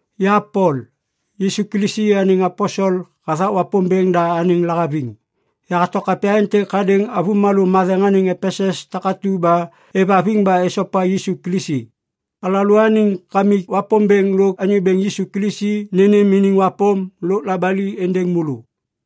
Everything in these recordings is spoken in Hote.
Ya Pol, Yisu Kilisi anêŋ aposel hathak Wapômbêŋ da anêŋ lahaviŋ. Yahato kapya êntêk hadêŋ avômalô matheŋ anêŋ Epesus takatu ba êvhaviŋ ba esopa Yisu Kilisi. Alalôaniŋ Kamik Wapômbêŋ lôk Anyô Bêŋ Yisu Kilisi nênêm iniŋ wapôm lôk labali êndêŋ môlô.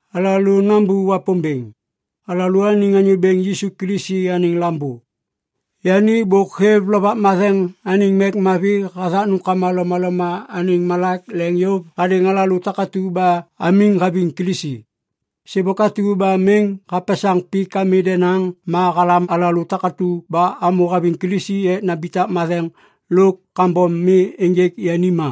Alalô nambô Wapômbêŋ, alalôaniŋ Anyô Bêŋ Yisu Kilisi anêŋ Lambô. Yani bôk hêv Lovak Matheŋ anêŋ mek mavi hathak nômkama lomaloma anêŋ malak leŋ yôv hadêŋ alalô takatu ba amiŋ haviŋ Kilisi. Sêbôk atu ba miŋ hapesaŋ pik ami denaŋ ma halam alalô takatu ba amô haviŋ Kilisi ek nambitak matheŋ lôk kambom mi ênjêk yani ma.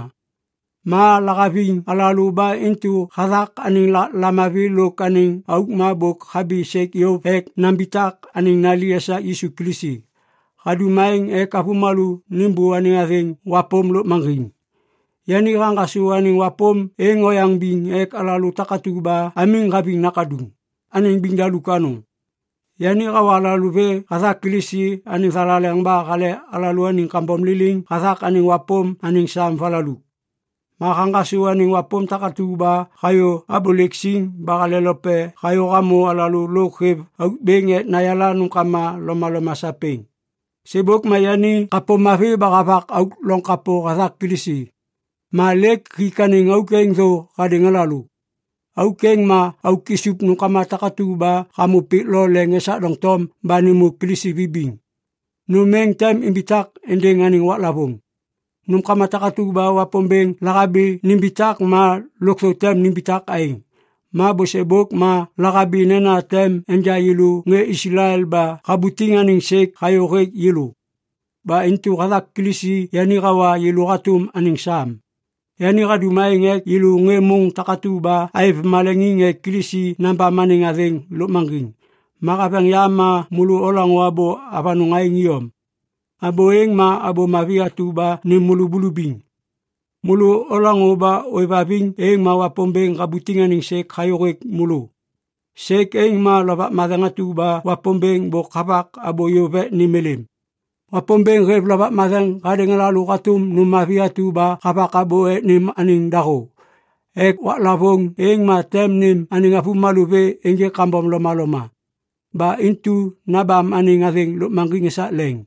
Ma lahaviŋ alalô ba intu hathak anêŋ lamavi lôk anêŋ auk ma bôk habi sêk yôv ek nambitak anêŋ nali esak Yisu Kilisi. Hadum aêŋ ek avômalô nêmbô anêŋ wapôm lôkmaŋgiŋ. Yani haŋgasô anêŋ wapôm êŋ oyaŋ biŋ ek alalô takatu ba amiŋ haviŋ Nakaduŋ, anêŋ biŋdaluk anôŋ. Yani hawa alalô vê hathak Kilisi anêŋ thalaleŋ ba hale alalôaniŋ kambom liliŋ hathak anêŋ wapôm anêŋ sam valaluk. Ma haŋgasô anêŋ wapôm takatu ba hayô abôlêk siŋ ba halelope hayô hamô alalô lôk hêv auk bêŋ ek nayala nômkama lomaloma sapêŋ. Sêbôk ma yani kapô mavi ba havak auk loŋ kapô hathak Kilisi. Ma lêk hik anêŋ auk êŋ thô hadêŋ alalô. Auk êŋ ma auk isup nômkama takatu ba hamô pik lo leŋ esak doŋtom ba nêmô Kilisi vibiŋ. Nôm êŋ tem imbitak êndêŋ anêŋ waklavôŋ. Nômkama takatu ba Wapômbêŋ lahabi nimbitak ma lôkthô tem nimbitak aêŋ. Ma bôsêbôk ma lahabi nena tem enja yêlô ŋê Islael ba habutiŋ anêŋ sêk hayô hêk yêlô. Ba intu hathak Kilisi yani hawa yêlô hatôm anêŋ sam. Yani hadum aêŋ ek yêlô ŋê môŋ takatu ba aêv maleŋiŋ ek Kilisi nabam anêŋ athêŋ lôkmaŋgiŋ. Ma haveŋ yam ma môlô olaŋô abô avanôŋ aêŋ iyom. Abô êŋ ma Abô Mavi atu ba nêm môlô bulubiŋ. Môlô olaŋô ba ôêvhaviŋ, êŋ ma Wapômbêŋ habutiŋ anêŋ sêk hayô hêk môlô. Sêk êŋ ma Lovak Matheŋ atu ba Wapômbêŋ bôk havak abô yôv ek nêm êlêm. Wapômbêŋ hêv Lovak Matheŋ hadêŋ alalô hatôm nôm mavi atu ba havak abô ek nêm anêŋ dahô, ek waklavôŋ êŋ ma tem nêm anêŋ avômalô vê ênjêk kambom lomaloma. Ba intu nabam anêŋ athêŋ lôkmaŋgiŋ esak leŋ.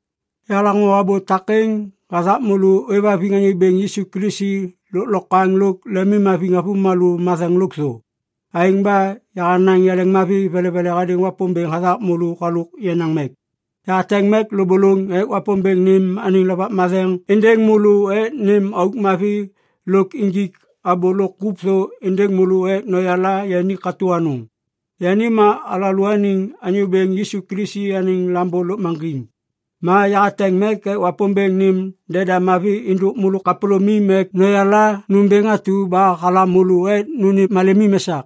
Yahalaŋô abô takêŋ hathak môlô ôêvhaviŋ Anyô Bêŋ Yisu Kilisi lôklokwaŋ lôk lemimhaviŋ avômalô matheŋ lôkthô. Aêŋ ba yahanaŋ yaleŋmavi velevele hadêŋ Wapômbêŋ hathak môlô halôk yenaŋ mek. Yahateŋ mek lôbôlôŋ ek Wapômbêŋ nêm anêŋ Lovak Matheŋ êndêŋ môlô ek nêm auk mavi lôk injik abô lôk kup thô êndêŋ môlô ek noyala yani katô anôŋ. Yani ma alalôaniŋ Anyô Bêŋ Yisu Kilisi anêŋ Lambô lôkmaŋgiŋ. Ma yahateŋ mek ek Wapômbêŋ nêm deda mavi êndôk môlô kapôlômim ek noyala nômbêŋ atu ba halam môlô ek nônêm malemim esak.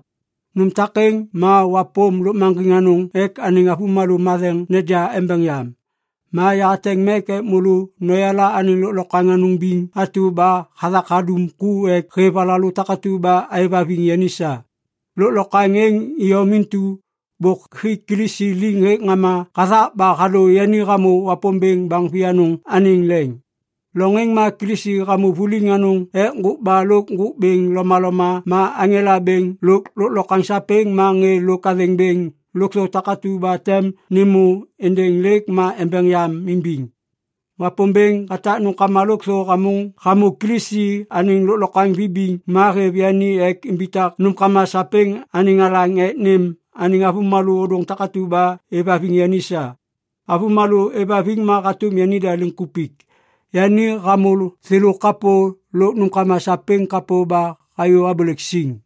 Nôm takêŋ ma wapôm lôkmaŋgiŋ anôŋ ek anêŋ avômalô matheŋ neja embeŋ yam. Ma yahateŋ ek môlô noyala anêŋ lôklokwaŋ anôŋ biŋ atu ba hathak hadum ku ek hêv alalô takatu ba aêvhaviŋ yani sa. Lôklokwaŋ êŋ iyom intu bôk hik Kilisi liŋ hêk ŋama hathak ba hadô yani hamô Wapômbêŋ baŋ vianôŋ anêŋ leŋ. Loŋ êŋ ma Kilisi hamô vuliŋ anôŋ ek ŋgôkba lôk ŋgôk bêŋ lomaloma ma aŋela bêŋ lôk lôklokwaŋ sapêŋ ma ŋê lôk athêŋ bêŋ lôkthô takatu ba tem nêmô êndêŋ lêk ma embeŋ yam imbiŋ. Wapômbêŋ hatak nômkama lôkthô hamô Kilisi anêŋ lôklokwaŋ vibiŋ ma hêv yani ek imbitak nômkama sapêŋ anêŋ alaŋ ek nêm anêŋ avômalô ôdôŋ takatu ba êvhaviŋ yani sa. Avômalô êvhaviŋ ma hatôm yanida liŋkupik. Yani hamô thêlô kapô lôk nômkama sapêŋ kapô ba hayô abôlêk siŋ.